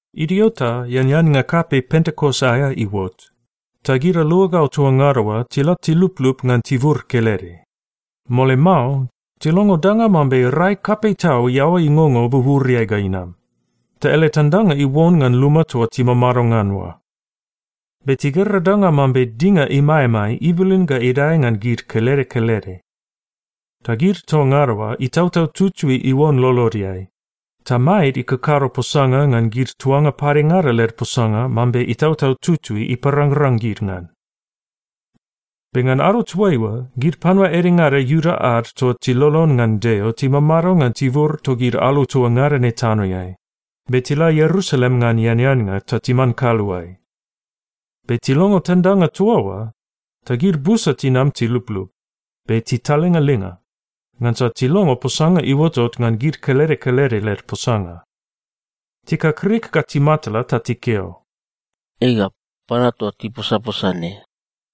Idio ta eaneannga kapei Pentekos aea iuot, ta gid aluagau toa ngada oa tila tiluplup ngan tibur kelede. Mole mao, tilongo danga mambe rai kapei tau iaoa ingongo buburiai ga inam, ta ele tandanga iuon ngan luma toa timamado ngan oa. Be tigera danga mambe dinga imaemae ibilin ga idae ngan gid kelede kelede. Ta gid toa ngada oa, Itautau Tutui iuon lolodeai, ta maed ikakado posanga ngan gid tuanga padengada led posanga mambe Itautau Tutui iparangrang gid ngan. Be ngan ado toaiua, gid panua edengada Iuda ad toa tilolon ngan Deo timamado ngan tibur togid alu toa ngada ne tanoeai, be tila Ierusalem ngan eaneannga ta timan kaluae. Be tilongo tandanga toa oa, ta gid busa tinam tiluplup, be titalingalinga, ngansa tilongo posanga iuotot ngan gid kelede kelede led posanga. Tikakrik ga timatala ta tikeo, “Ega, panua toa tiposaposa ne,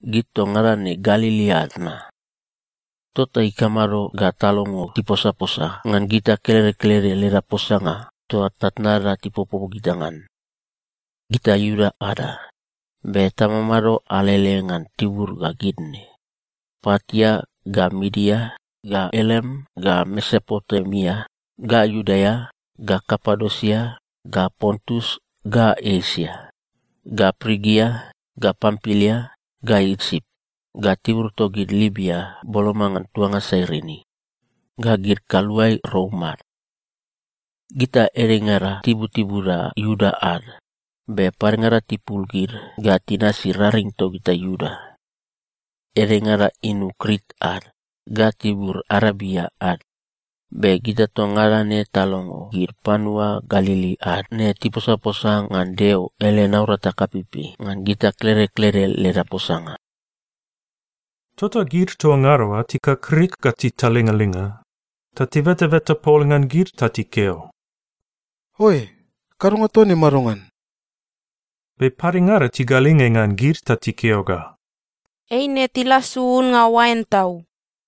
gid toa ngada ne Galili ad na? Tota ikamado ga talongo tiposaposa ngan gita kelede kelede leda posanga toa tnatnada tipopo gita ngan? Gita Iuda ada, be tamamado alele ngan tibur ga gid ne: Partia, ga Midia, ga Elam, ga Mesopotemia, ga Iudea, ga Kapadosia, ga Pontus, ga Esia, ga Prigia, ga Pampilia, ga Isip, ga tibur togid Libia boloma ngan tuanga Sairini, ga gid kaluae Rom ad. Gita edengada tibutibuda Iuda ad, be padengada tipul gid ga tinasi raring togita Iuda. Edengada inu Krit ad, ga tibur Arebia ad, be gita toa ngada ne talongo gid panua Galili ad ne tiposaposa ngan Deo ele naurata kapeipei ngan gita kelede kelede leda posanga!” Tota gid toa ngada oa tikakrik ga titalingalinga, ta tibetabeta pol ngan gid ta tikeo, “Oae! Kadonga toa ne madongan?” Be padengada tigalinge ngan gid ta tikeo ga, “Eine tilasu unnga oain tau!”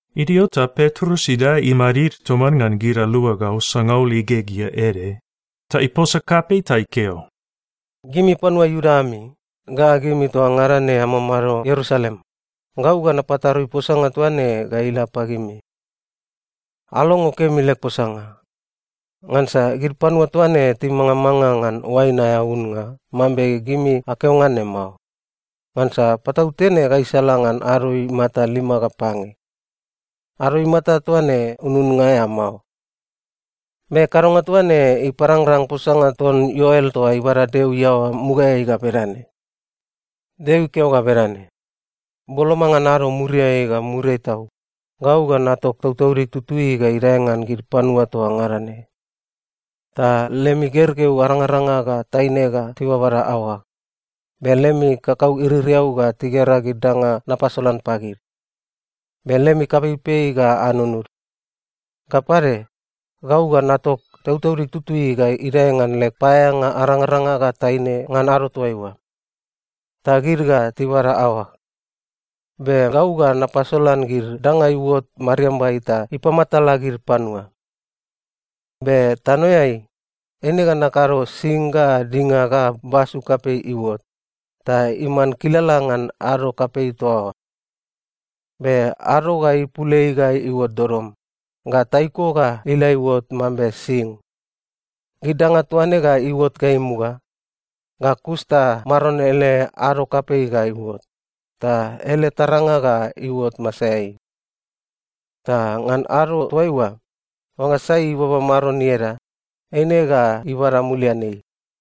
Idio ta Petrus idae imadid toman ngan gid aluagau sangaul igegea ede, ta iposa kapei ta ikeo, “Gimi panua Iuda ami, ga gimi toa ngada ne amamado Ierusalem, gau ga napatarui posanga toa ne ga ila pagimi. Alongo kemi leg posanga. Ngansa gid panua toa ne timangamanga ngan oain aea unnga mambe gimi akeo ngan ne mao, ngansa patautene gaisala ngan ado imata lima ga pange. Ado imata toa ne ununnga aea mao. Be kadonga toa ne iparangrang posanga ton Ioel toa ibada Deo iaoa mugaeai ga bedane, “‘Deo ikeo ga bedane, “Boloma ngan ado muriai ga muriai tau, gau ga natok Tautaudig Tutui ga idae ngan gid panua toa ngada ne. Ta lemi gergeu arangaranga ga taine ga tibabada aoag, be lemi kakau iririau ga tigera gid danga napasolan pagid, be lemi kapeipei ga anununud. Ga pade, gau ga natok Tautaudig Tutui ga idae ngan leg paeaeanga arangaranga ga taine ngan ado toaiua. Ta gid ga tibada aoag. Be gau ga napasolan gid danga iuot mariambai ta ipamatala gid panua. Be tanoeai, eine ga nakado sing ga dinga ga basu kapei iuot, ta iman kilala ngan ado kapei toa oa. Be ado ga ipul ei ga iuot dodom, ga taiko ga ila iuot mambe sing. Gid danga toa ne ga iuot ga imuga. Ga kus ta Maron ele ado kapei ga iuot, ta ele taranga ga iuot masaeai. Ta ngan ado toaiua, oangga sai ibaba Maron ieda, eine ga ibada mulian ei.” ’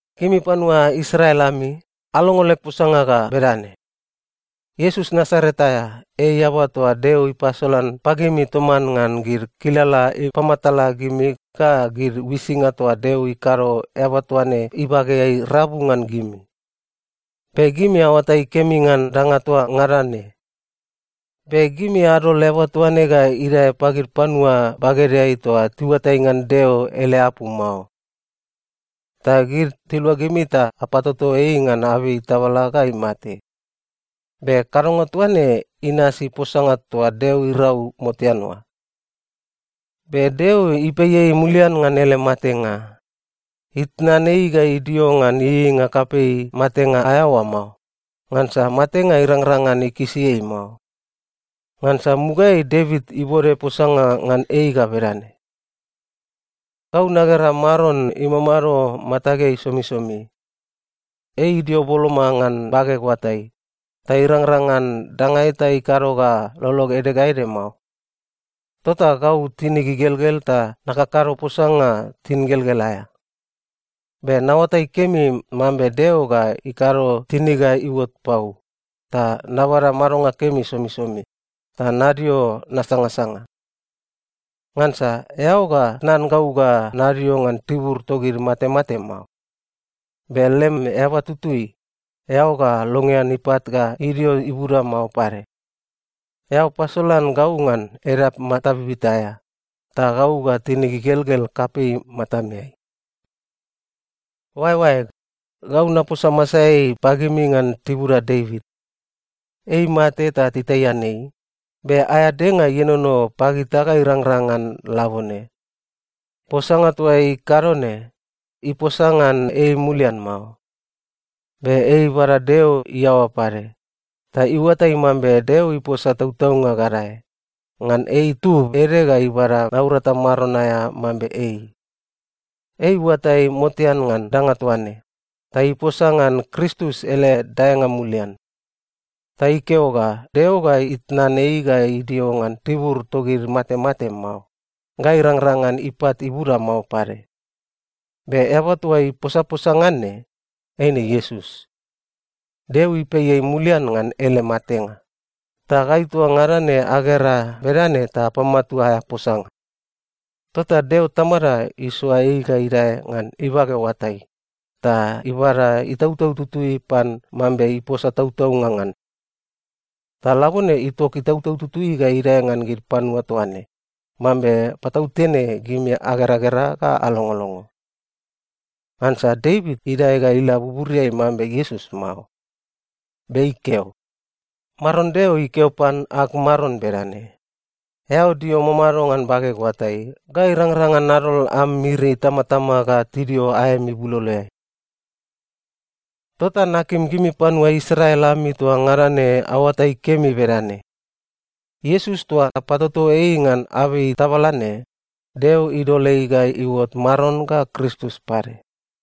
“Gimi panua Israel ami, alongo leg posanga ga bedane: Iesus Nasaret aea, ei eaba toa Deo ipasolan pagimi toman ngan gid kilala ipamatala gimi ga gid uisinga toa Deo ikado eaba toa ne ibageai rabu ngan gimi. Be gimi aoatai kemi ngan danga toa ngada ne. Be gimi adol eaba toa ne ga idae pagid panua bagedeai toa tiuatai ngan Deo ele apu mao. Ta gid tilua gimi ta apatoto ei ngan abei tabala ga imate. Be kadonga toa ne inasi posanga toa Deo irau motean oa. Be Deo ipei ei mulian ngan ele matenga. Itnan ei ga idio ngan ieieinga kapei matenga aea oa mao, ngansa matenga irangrang ngan ikisi ei mao. Ngansa mugaeai Devit ibode posanga ngan ei ga bedane, “‘Gau nagera Maron imamado matageai somisomi. Ei idio boloma ngan bageg oatai, ta irangrang ngan danga eta ikado ga lolog ede ga ede mao. Tota gau tinig igelgel ta nakakado posanga tingelgel aea. Be naoatai kemi mambe Deo ga ikado tinig ga iuot pau, ta nabada madonga kemi somisomi, ta nadio nasangasanga. Ngansa eao ga tnan gau ga nadio ngan tibur togid matemate mao. Be lem eaba tutui, eao ga longean ipat ga idio ibuda mao pade. Eao pasolan gau ngan edap mata bibita aea, ta gau ga tinig igelgel kapei matameai.’ “Oaeoaeg, gau naposa masaeai pagimi ngan tibuda Devit. Ei imate ta titaian ei, be aea denga ienono pagita ga irangrang ngan labone. Posanga toa ikado ne, iposa ngan ei mulian mao. Be ei ibada Deo iaoa pade, ta iuatai mambe Deo iposa tautaunga gadae, ngan ei itub ede ga ibada naurata maron aea mambe ei. Ei iuatai motean ngan danga toa ne, ta iposa ngan Kristus ele daenga mulian. Ta ikeo ga Deo ga itnan ei ga idio ngan tibur togid matemate mao, ga irangrang ngan ipat ibuda mao pade. Be eaba toa iposaposa ngan ne, eine Iesus. Deo ipei ei mulian ngan ele matenga, ta gai toa ngada ne agera bedane ta apamatua aea posanga. Tota Deo Tamada isoa ei ga idae ngan ibage oatai, ta ibada Itautau Tutui pan mambe iposa tautaunga ngan. Ta labone itok Itautau Tutui ga idae ngan gid panua toa ne, mambe patautene gimi ageragera ga alongolongo. Ngansa Devit idae ga ila buburiai mambe Iesus mao. Be ikeo, “‘Maron Deo ikeo pan ag Maron bedane: “Eao dio mamado ngan bageg oatai ga irangrang ngan nadol am miri itamatama ga tidio aem ibuloloeai.” ’ “Tota nakim gimi panua Israel ami toa ngada ne aoatai kemi bedane: Iesus toa apatoto ei ngan abei tabala ne, Deo idol ei ga iuot Maron ga Kristus pade.”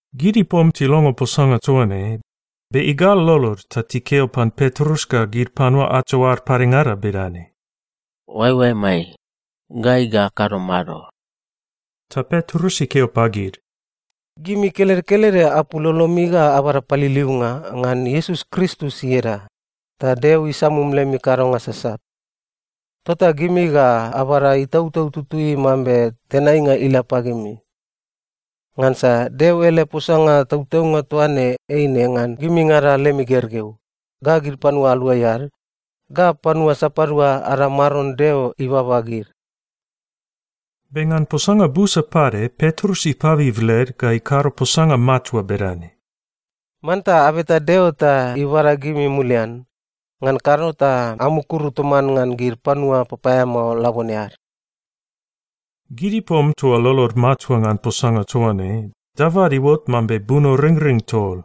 Gid ipom tilongo posanga toa ne, be igal lolod ta tikeo pan Petrus ga gid panua ato ad padengada bedane, “Oaeoaemai, gai ga akado mado?” Ta Petrus ikeo pagid, “Gimi kelede kelede apul lolomi ga abada paliliunga ngan Iesus Kristus ieda, ta Deo isamum lemi kadonga sasat. Tota gimi ga abada Itautau Tutui mambe tenainga ila pagimi. Ngansa Deo ele posanga tautaunga toa ne eine ngan gimingada lemi gergeu, ga gid panua aluai ad, ga panua sapadua ada Maron Deo ibaba gid.” Be ngan posanga busa pade Petrus ipabib led ga ikado posanga matua bedane, “Manta abeta Deo ta ibada gimi mulian, ngan kado ta amukuru toman ngan gid panua papaeamao labone ad!” Gid ipom toa lolod matua ngan posanga toa ne, dabad iuot mambe bunoringring tol.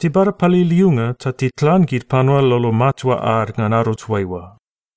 Tibada paliliunga ta titlan gid panua lolo matua ad ngan ado toaiua.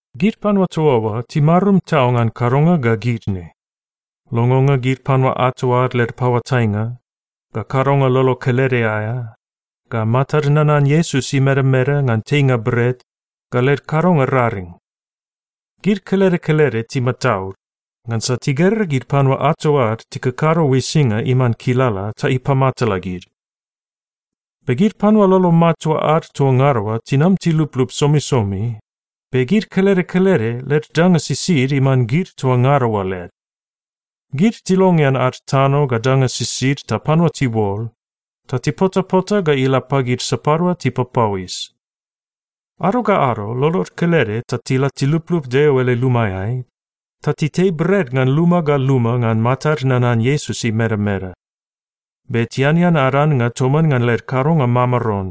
Gid panua toa oa timarum tau ngan kadonga ga gid ne: longonga gid panua ato ad led paoatainga, ga kadonga lolo kelede aea, ga matad nanan Iesus imedameda ngan teinga bret, ga led kadonga raring. Gid kelede kelede timataud, ngansa tigera gid panua ato ad tikakado uisinga iman kilala ta ipamatala gid. Be gid panua lolo matua ad toa ngada oa tinam tiluplup somisomi, be gid kelede kelede led danga sisid iman gid toa ngada oa led. Gid tilongean ad tano ga danga sisid ta panua tiuol, ta tipotapota ga ila pagid sapadua tipapauis. Ado ga ado, lolod kelede ta tila tiluplup Deo ele lumaeai, ta titei bret ngan luma ga luma ngan matad nanan Iesus imedameda. Be tianean ad annga toman ngan led kadonga mamaron,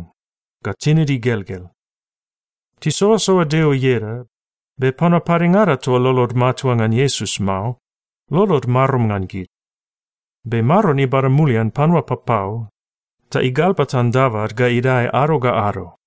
ga tinid igelgel. Tisoasoa Deo ieda, be panua padengada toa lolod matua ngan Iesus mao, lolod marum ngan gid. Be Maron ibada mulian panua papau, ta igalbatan dabad ga idae ado ga ado.